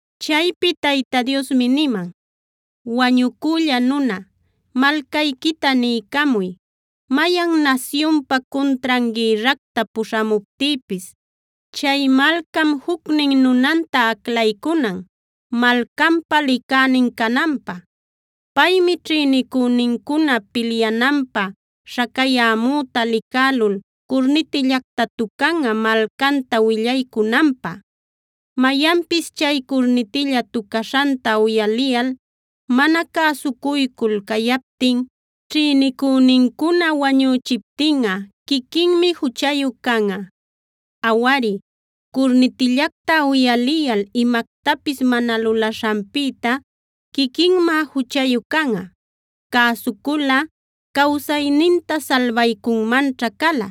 Chaypi Tayta Diosmi niman: “Wañucülla nuna, malcayquita niycamuy: ‘Mayan nasyunpa cuntran gïrracta puśhamuptïpis, chay malcam jucnin nunanta aclaycunan, malcanpa licänin cananpä. Paymi ćhïnicünincuna pilyananpä śhacayämüta licälul curnitillacta tucanꞌa malcanta willaycunanpä. Mayanpis chay curnitilla tucaśhanta uyaliyal mana cäsucuycul cayaptin, ćhïnicünincuna wañüchiptinꞌa quiquinmi juchayu canꞌa. Awari, curnitillacta uyaliyal imactapis mana lulaśhanpïta quiquinmá juchayu canꞌa. Cäsuculꞌa cawsayninta salbaycunmanćha cala.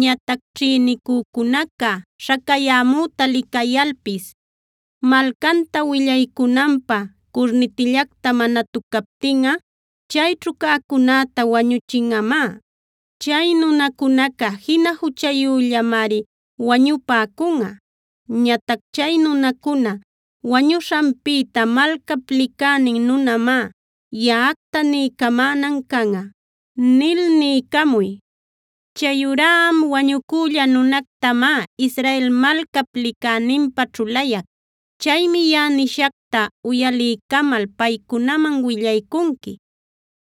Ñatac ćhïnicücunaca śhacayämüta licayalpis malcanta willaycunanpä curnitillacta mana tucaptinꞌa chayćhu cäcunäta wañüchinꞌamá. Chay nunacunaca jina juchayüllamari wañupäcunꞌa. Ñatac chay nunacuna wañuśhanpïta malcap licänin nunamá yaꞌacta niycamänan canꞌa’ nil niycamuy. “Chayurá am wañüculla nunactamá, Israel malcap licäninpä ćhulayac. Chaymi yaꞌa nishacta uyaliycamal paycunaman willaycunqui.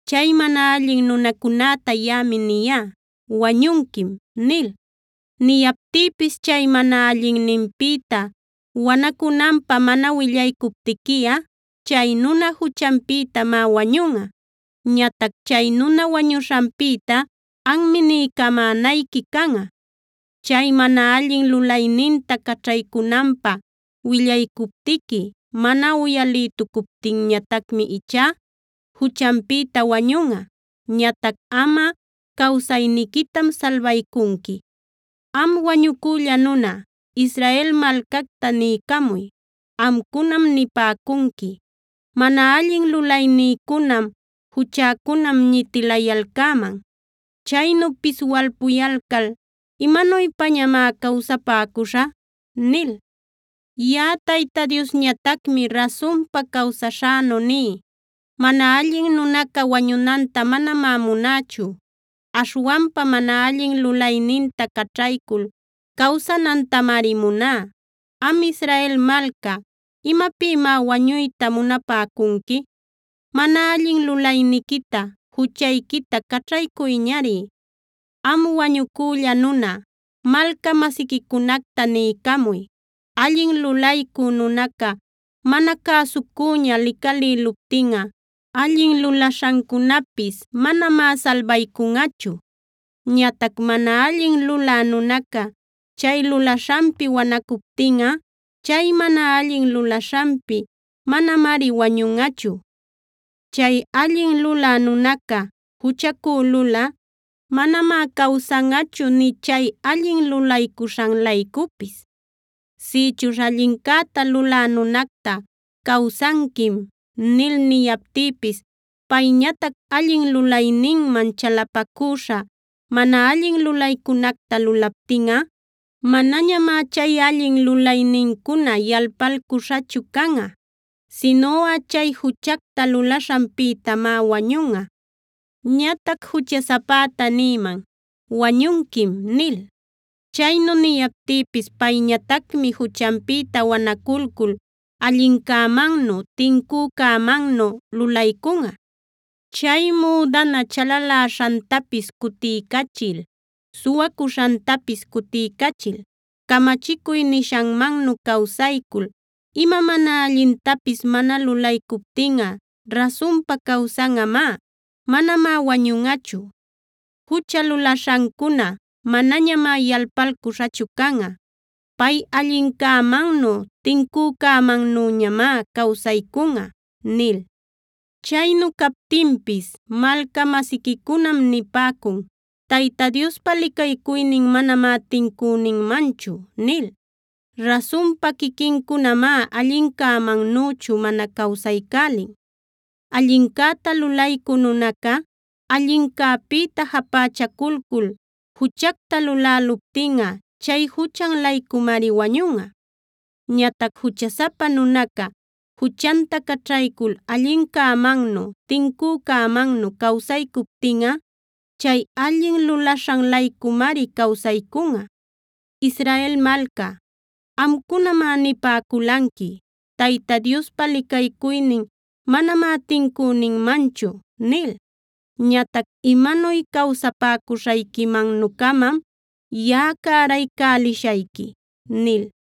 Chay mana allin nunacunäta yaꞌami niyá: ‘Wañunquim’ nil. Niyaptïpis chay mana allinninpïta wanacunanpä mana willaycuptiquiꞌa, chay nuna juchanpïtamá wañunꞌa. Ñatac chay nuna wañuśhanpïta anmi niycamänayqui canꞌa. Chay mana allin lulayninta caćhaycunanpä willaycuptiqui, mana uyalïtucuptinñatacmi ichá juchanpïta wañunꞌa. Ñatac amꞌa cawsayniquitam salbaycunqui. “Am wañucülla nuna, Israel malcacta niycamuy: ‘Amcunam nipäcunqui: Mana allin lulaynïcunam, juchäcunam ñitilayalcäman. Chaynu piswalpuyalcal, ¿imanuypañamá cawsapäcuśhä?’ nil. Yaꞌa Tayta Diosñatacmi rasunpa cawsaśhänu ní: Mana allin nunaca wañunanta manamá munächu. Aśhwanpa mana allin lulayninta caćhaycul cawsanantamari muná. Am Israel malca, ¿imapïmá wañuyta munapäcunqui? Mana allin lulayniquita, juchayquita caćhaycuyñari. Am wañucülla nuna, malca-masiquicunacta niycamuy: ‘Allin lulaycü nunaca mana cäsucüña licalïluptinꞌa allin lulaśhancunapis manamá salbaycunꞌachu. Ñatac mana allin lulä nunaca chay lulaśhanpi wanacuptinꞌa, chay mana allin lulaśhanpi manamari wañunꞌachu. Chay allin lulä nunaca juchacülulꞌa manamá cawsanꞌachu nï chay allin lulaśhan-laycupis. Sïchuśh allincäta lulä nunacta “Cawsanquim” nil niyaptïpis payñatac allin lulayninman chalapacüśha mana allin lulaycunacta lulaptinꞌa, manañamá chay allin lulaynincuna yalpalcuśhachu canꞌa. Sinuꞌa chay juchacta lulaśhanpïtamá wañunꞌa. Ñatac juchasapäta nïman: “Wañunquim” nil. Chaynu niyaptïpis payñatacmi juchanpïta wanaculcul allincämannu, tincücämannu lulaycunꞌa. Chay müdana chalaläśhantapis cutiycachil, suwacuśhantapis cutiycachil camachicuy nishanmannu cawsaycul, ima mana allintapis mana lulaycuptinꞌa rasunpa cawsanꞌamá. Manamá wañunꞌachu. Jucha lulaśhancuna manañamá yalpalcuśhachu canꞌa. Pay allincämannu tincücämannüñamá cawsaycunꞌa’ nil. “Chaynu captinpis malca-masiquicunam nipäcun: ‘Tayta Diospa licaycuynin manamá tincüninmanchu’ nil. Rasunpa quiquincunamá allincämannüchu mana cawsaycälin. Allincäta lulaycü nunaca, allincäpïta japächaculcul juchacta luläluptinꞌa chay juchan-laycumari wañunꞌa. Ñatac juchasapa nunaca juchanta caćhaycul allincämannu, tincücämannu cawsaycuptinꞌa, chay allin lulaśhan-laycumari cawsaycunꞌa. Israel malca, amcunamá nipäculanqui: ‘Tayta Diospa licaycuynin manamá tincüninmanchu’ nil. Ñatac imanuy cawsapäcuśhayquimannu-camam yaꞌa cäraycälishayqui” nil.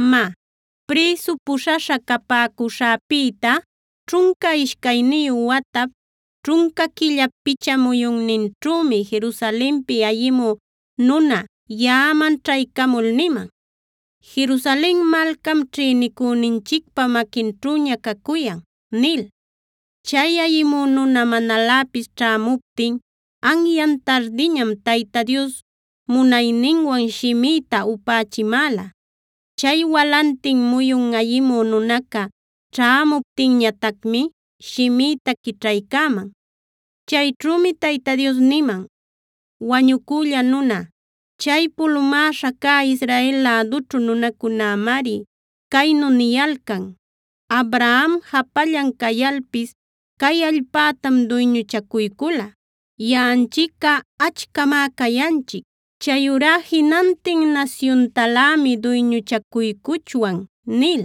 Má, prïsu puśhaśha capäcuśhäpïta ćhunca ishcayniyu watap, ćhunca quillap picha muyunninćhümi Jerusalenpi ayimü nuna yaꞌaman ćhaycamul niman: “Jerusalen malcam ćhïnicüninchicpa maquinćhüña cacuyan” nil. Chay ayimü nuna manaläpis ćhämuptin anyan tardiñam Tayta Dios munayninwan shimïta upächimäla. Chay walantin muyun ayimü nunaca ćhämuptinñatacmi shimïta quićhaycäman. Chayćhümi Tayta Dios niman: “Wañucülla nuna, chay pulumäśha cä Israel lädućhu nunacunämari caynu niyalcan: ‘Abraham japallan cayalpis cay allpätam duyñuchacuycula. Yaꞌanchicꞌa achcamá cayanchic. Chayurá jinantin nasyuntalämi duyñuchacuycuchwan’ nil.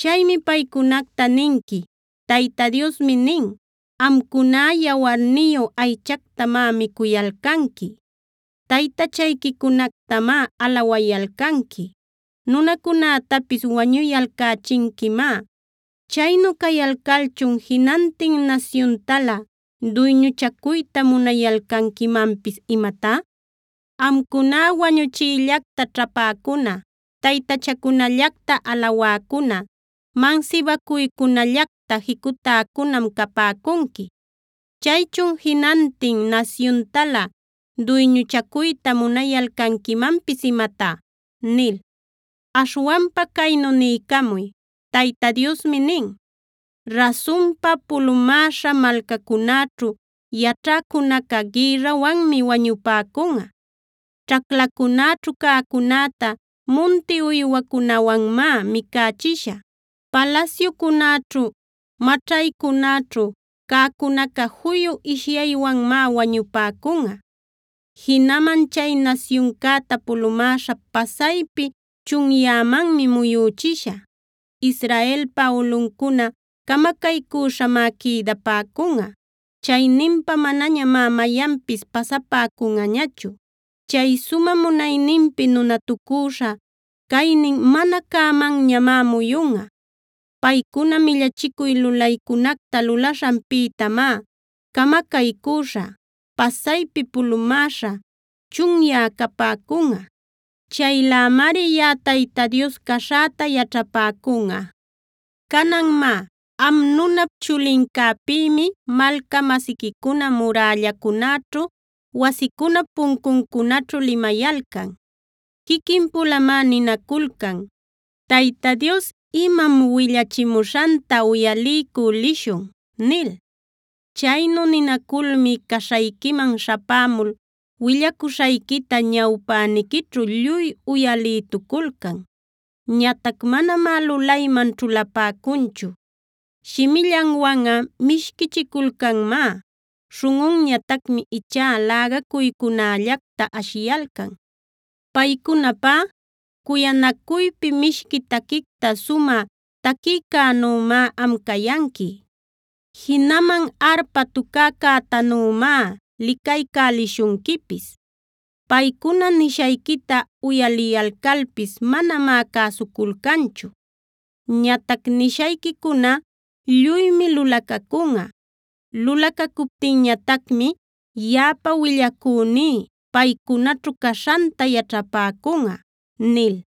Chaymi paycunacta ninqui: Tayta Diosmi nin: Amcuná, yawarniyu aychactamá micuyalcanqui, taytachayquicunactamá alawayalcanqui, nunacunätapis wañuyalcächinquimá. ¿Chaynu cayalcalchun jinantin nasyuntalä duyñuchacuyta munayalcanquimanpis imatá? Amcuná wañuchiyllacta ćhapäcuna, taytachacunacllacta alawäcuna, mansibacuycunallacta jicutäcunam capäcunqui. ¿Chaychun jinantin nasyuntalä duyñuchacuyta munayalcanquimanpis imatá?” nil. Aśhwanpa caynu niycamuy: Tayta Diosmi nin: Rasunpa, pulumäśha malcacunäćhu yaćhäcunaca gïrrawanmi wañupäcunꞌa. Ćhaclacunäćhu cäcunäta munti uywacunawanmá micächishä. Palasyucunaćhu, maćhaycunaćhu cäcunaca juyu ishyaywanmá wañupäcunꞌa. Jinaman chay nasyuncäta pulumäśha pasaypi chunyämanmi muyüchishä. Israelpa ulꞌuncuna camacaycüśhamá quïdapäcunꞌa. Chayninpa manañamá mayanpis pasapäcunꞌañachu. Chay sumä munayninpi nunatucüśha caynin mana cämanñamá muyunꞌa. Paycuna millachicuy lulaycunacta lulaśhanpïtamá camacaycüśhä, pasaypi pulumäśha, chunyä capäcunꞌa. Chaylämari yaꞌa Tayta Dios caśhäta yaćhapäcunꞌa. “Canan má, am nunap chulincäpïmi malca-masiquicuna murällacunäćhu, wasicunap puncuncunaćhu limayalcan. Quiquin-pulamá ninaculcan: ‘Tayta Dios imam willachimuśhanta uyaliycü lishun’ nil. Chaynu ninaculmi caśhayquiman śhapämul willacuśhayquita ñawpäniquićhu lluy uyalïtuculcan. Ñatac manamá lulayman ćhulapäcunchu. Shimillanwanꞌa mishquichiculcanmá; śhunꞌunñatacmi ichá lägacuycunällacta ashiyalcan. Paycunapá, cuyanacuypi mishqui taquicta sumä taquïcänümá am cayanqui. Jinaman arpa tucäcätanümá licaycälishunquipis. Paycuna nishayquita uyaliyalcalpis manamá cäsuculcanchu. Ñatac nishayquicuna lluymi lulacacunꞌa; lulacacuptinñatacmi yaꞌapa willacüní paycunaćhu caśhanta yaćhapäcunꞌa” nil.